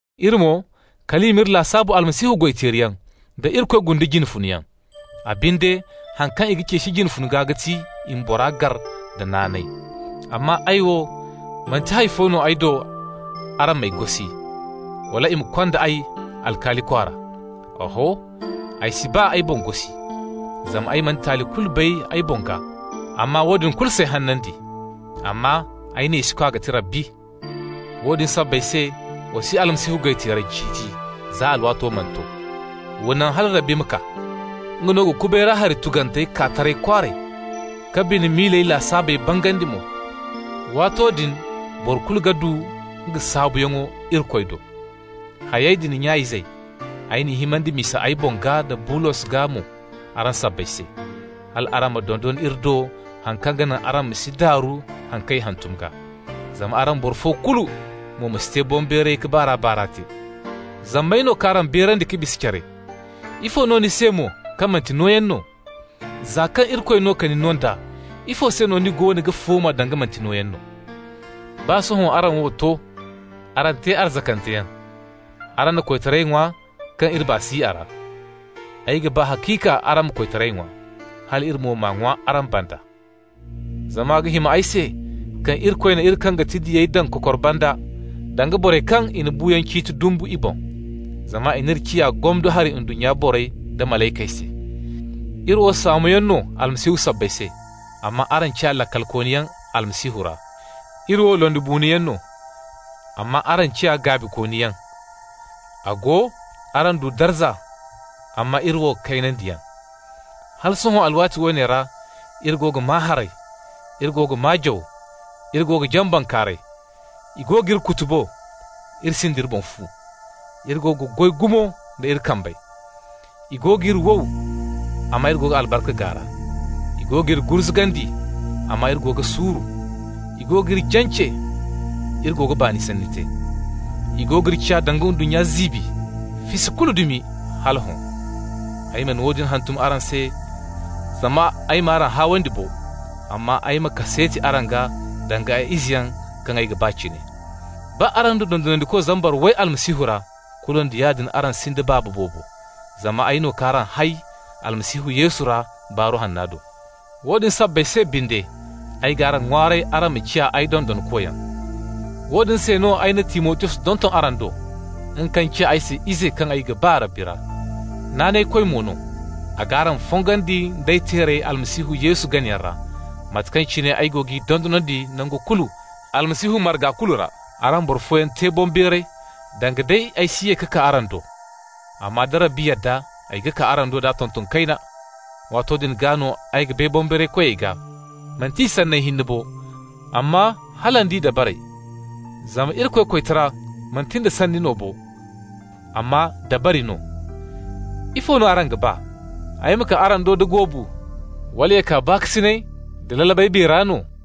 Iri mo, kal i m'iri lasaabu Almasihu goy-teeriyaŋ, da Irikoy gundu jine funeyaŋ. A binde, haŋ kaŋ i ga ceeci jine funa gaa ga ti i ma bora gar da naanay. Amma ay wo, manti hay fo no ay do araŋ m'ay gosi, wala i ma kond'ay alkaali kwaara. Oho, ay si baa ay boŋ gosi. Zama ay mana taali kulu bay ay boŋ gaa, amma woodin kulu s'ay hanandi. Amma ay neesikwa ga ti Rabbi. Woodin sabbay se, wa si Almasihu goy-teerey ciiti za alwaato mana to. Wa naŋ hala Rabbi ma kaa. Nga no ga kubay ra hari tugantey kaa taray kwaaray, ka bine miila lasaabey bangandi mo. Waato din boro kulu ga du nga saabuyaŋo Irikoy do. Hayey din, nya-izey, ay n'i himandi misa ay boŋ gaa da Abolos gaa mo araŋ sabbay se, hal araŋ ma dondon iri do haŋ kaŋ ga naŋ araŋ ma si daaru haŋ kaŋ i hantum gaa. Zama araŋ boro fo kulu mo ma si te boŋbeeray ka baar'a-baar'a te. Zama may no k'araŋ beerandi ka bisa care? Ifo no ni se mo kaŋ manti nooyaŋ no? Za kaŋ Irikoy no ka ni no nd'a, ifo se no ni goono ga fooma, danga manti nooyaŋ no? Baa sohõ araŋ wo to, araŋ te arzakanteyaŋ, araŋ na koytaray ŋwa kaŋ iri baa si a ra! Ay ga ba haciika araŋ ma koytaray ŋwa, hal iri mo m'a ŋwa araŋ banda. Zama a ga hima ay se kaŋ Irikoy na iri, kaŋ ga ti diyey daŋ kokor banda, danga borey kaŋ i na buuyaŋ ciiti dumbu i boŋ. Zama i n'iri ciya gomdo hari ndunnya borey da malaykey se. Iri wo saamoyaŋ no Almasihu sabbay se, amma araŋ ciya laakalkooniyaŋ Almasihu ra! Iri wo londibuunoyaŋ no, amma araŋ ciya gaabikooniyaŋ! A go, araŋ du darza, amma iri wo kaynandiyaŋ! Hala sohõ alwaati woone ra iri go ga maa haray, iri go ga maa jaw, iri go ga jaŋ bankaaray, i go g'iri kutubo, iri sinda iri boŋ fu. Iri go ga goy gumo nda iri kambey. I go g'iri wow, amma iri go ga albarka gaara. I go g'iri gurzugandi, amma iri go ga suuru. I go g'iri jance, iri go ga baani sanni te. I go g'iri ciya danga ndunnya ziibi, fisi kulu dumi, hala hõ. Ay mana woodin hantum araŋ se zama ay m'araŋ haawandi bo, amma ay ma kaseeti araŋ gaa danga ay izeyaŋ kaŋ ay ga ba cine. Baa araŋ du dondonandiko zambar way Almasihu ra, kulu nda yaadin araŋ sinda baaba boobo, zama ay no k'araŋ hay Almasihu Yesu ra Baaru Hanna do. Woodin sabbay se binde ay g'araŋ ŋwaaray araŋ ma ciya ay dondonkoyaŋ. Woodin se no ay na Timotiyos donton araŋ do, nga kaŋ ciya ay se ize kaŋ ay ga ba Rabbi ra, naanaykoy mo no. A g'araŋ fongandi d'ay teerey Almasihu Yesu ganayaŋ ra, mate kaŋ cine ay go g'i dondonandi nangu kulu Almasihu marga kulu ra. Araŋ boro fooyaŋ te boŋbeeray danga day ay si ye ka kaa araŋ do. Amma da Rabbi yadda, ay ga kaa araŋ do d'a tonton kayna. Waato din gaa no, ay ga bay boŋbeeray koyey gaa, manti i sanney hinne bo, amma hala nd'i dabarey. Zama Irikoy koytara, manti nda sanni no bo, amma dabari no. Ifo no araŋ ga ba? Ay ma kaa araŋ do da goobu, wala ya kaa baakasinay da lalabay biya ra no?